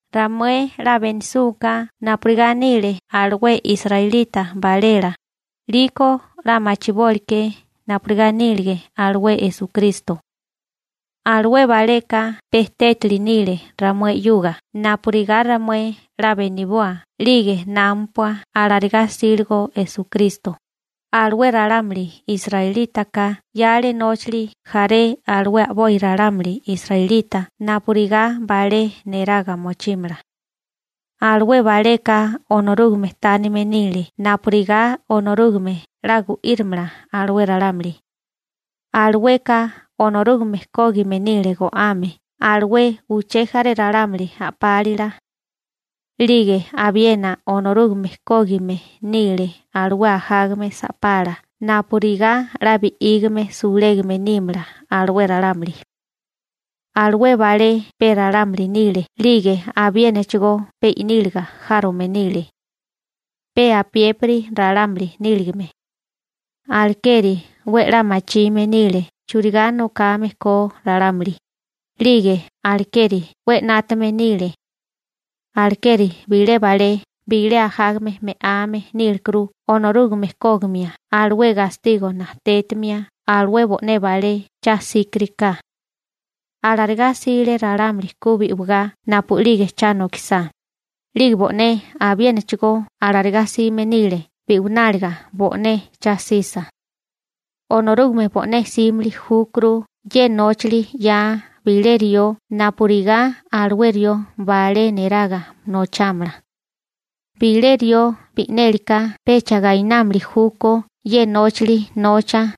Ramué 'la benisúká napurigá nile alué israelita balela, 'liko 'la machibóliké napurigá nílige alué Esukristo. Alué baleka pe tétali nile ramué 'yuga napurigá ramué 'la beniboa 'lige námapua alarigá 'síligo Esukristo. Alué ralámuli israelítaka 'yale nóchali jaré alué a'boi ralámuli israelita napurigá balé neraga mochímala. Alué baleka Onorúgame tánime nile napurigá Onorúgame 'la gu'írimala alué ralámuli. Alueka Onorúgame kógime nile go'ame alué uché jaré ralámuli a'pálila. 'Lige abiena Onorúgame kógime nile alué ajágame sa'pala napurigá 'la bi'ígame sulégame nímala alué ralámuli. Alué balé pe ralámuli nile 'lige abiénachigó pe i'níliga járome nile, pe apiépiri ralámuli níligame. Alekeri 'we 'la machime nile churigá nokame ko ralámuli, 'lige alekeri 'we na'tamame nile. Alekeri bilé balé bilé ajágame me'ame nílekuru Onorúgame kógimia alué gastigo najtétimia alué bo'né balé cha 'síkiriká. Alarigá 'sile ralámuli ku bi'wigá napu'lige cha nokisá, 'lige bo'né abiénachigó alarigá 'sime nile bi'wináliga bo'né cha'sisa. Onorúgame bo'né 'símili júkuru ye nóchali 'yaa bilé rió napurigá alué rió balé neraga nochámala. Bilé rió bi'nélika pecha gainámili júkó ye nóchali nocha.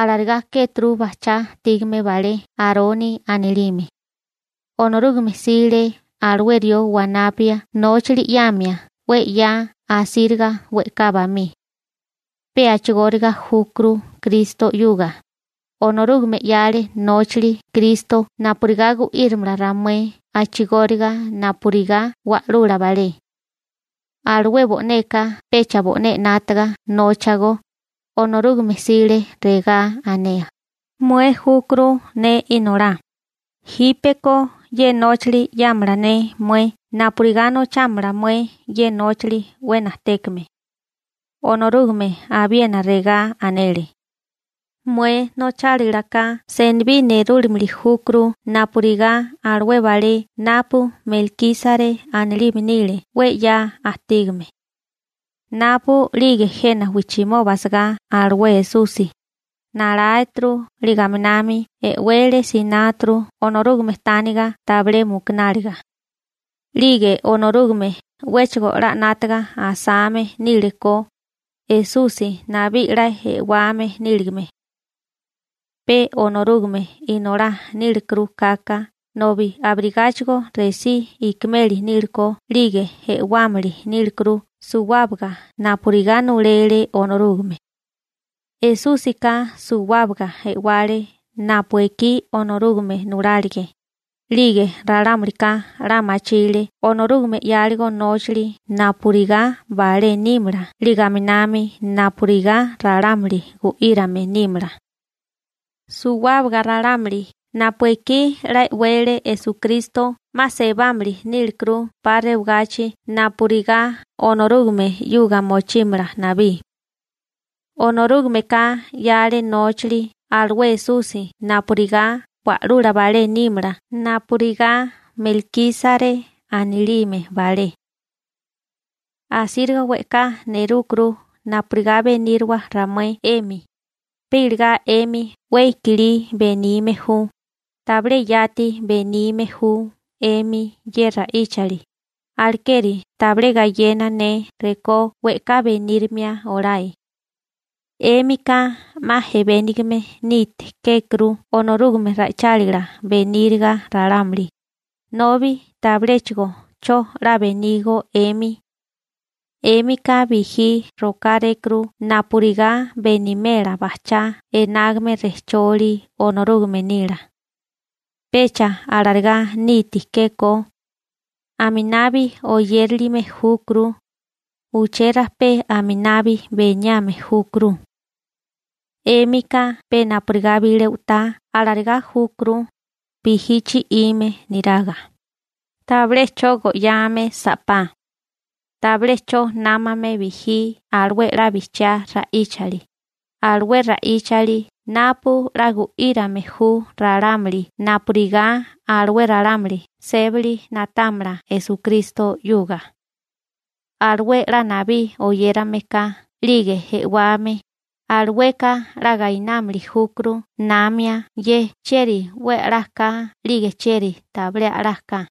Alarigá kéturu bajchá ajtígame balé Aroni anilime. Onorúgame 'sile alué rió wanapia nóchali 'yamia 'we 'ya asíriga we'ká bamí. Pe a'chigóriga júkuru Kristo 'yuga, Onorúgame 'yale nóchali Kristo napurigá gu'írimala ramué a'chigóriga napurigá wa'lula balé. Alué bo'neka pecha bo'né 'nátaga nóchago. Onorúgame 'sile regá anea: Mué júkuru ne Inolá, jípeko ye nóchali 'yámala ne mué napurigá nochámala mué ye nóchali 'we najtékame. Onorúgame abiena regá anele: Mué nochálilaká senibí nerúmili júkuru napurigá alué balé napu Melkísare anilime nile 'we 'ya ajtígame. Napu'lige jena wijchimoba asagá alué Esusi, naláeturu 'lige aminami e'wele sináturu Onorúgame tániga tabilé mukunáliga. 'Lige Onorúgame 'wéchigo 'la 'nátaga asame níliko, Esusi nabí 'la e'wame níligame. Pe Onorúgame Inolá nílekuru kaka nobi abirigáchigo resí ikimeli nílekó 'lige e'wámili nílekuru suwábaga napurigá nulele Onorúgame. Esúsika suwábaga e'wale napu ekí Onorúgame nulálige, 'lige ralámulika 'la machile Onorúgame 'yáligo nóchali napurigá balé nímala 'lige aminami napurigá ralámuli gu'írame nímala. Suwábaga ralámuli napu ekí 'la e'wele Esukristo 'ma sebámili nílekuru 'pa rewagachi napurigá Onorúgame 'yuga mochímala nabí. Onorúgameka 'yale nóchali alué Esusi napurigá wa'lula balé nímala napurigá Melkísare anilime balé. Asíriga we'ká nerúkuru napurigá beníriwa ramué 'emi, pe iligá 'emi 'we i'kilí benime ju, tabilé yati benime ju 'emi ye ra'íchali, alekeri tabilé gayena ne rekó we'ká benírimia olae. 'Émika 'ma ejebénigame niti kékuru Onorúgame ra'ichálila beníriga ralámuli, nobi tabiléchigo 'cho 'la benígó 'emi. 'Émika bijí rokárékuru napurigá benimela bajchá enágame rejcholi Onorúgame nila. Pecha alarigá niti kékó. Aminabi oyérilime júkuru, uché rajpé aminabi beniame júkuru. 'Émika pe napurigá bilé u'tá alarigá júkuru, bijí chi'ime niraga, tabilé 'cho go'yame sa'pá. Tabilé 'cho námame bijí alué 'la bijchiá ra'íchali, alué ra'íchali napu 'la gu'írame ju ralámuli napurigá alué ralámuli sébali na'támala Esukristo 'yuga. Alué 'la nabí oyérame ka 'lige e'wame, alueka 'la gainámili júkuru namia ye chieri 'we a'lá ka 'lige chieri tabilé a'lá ka.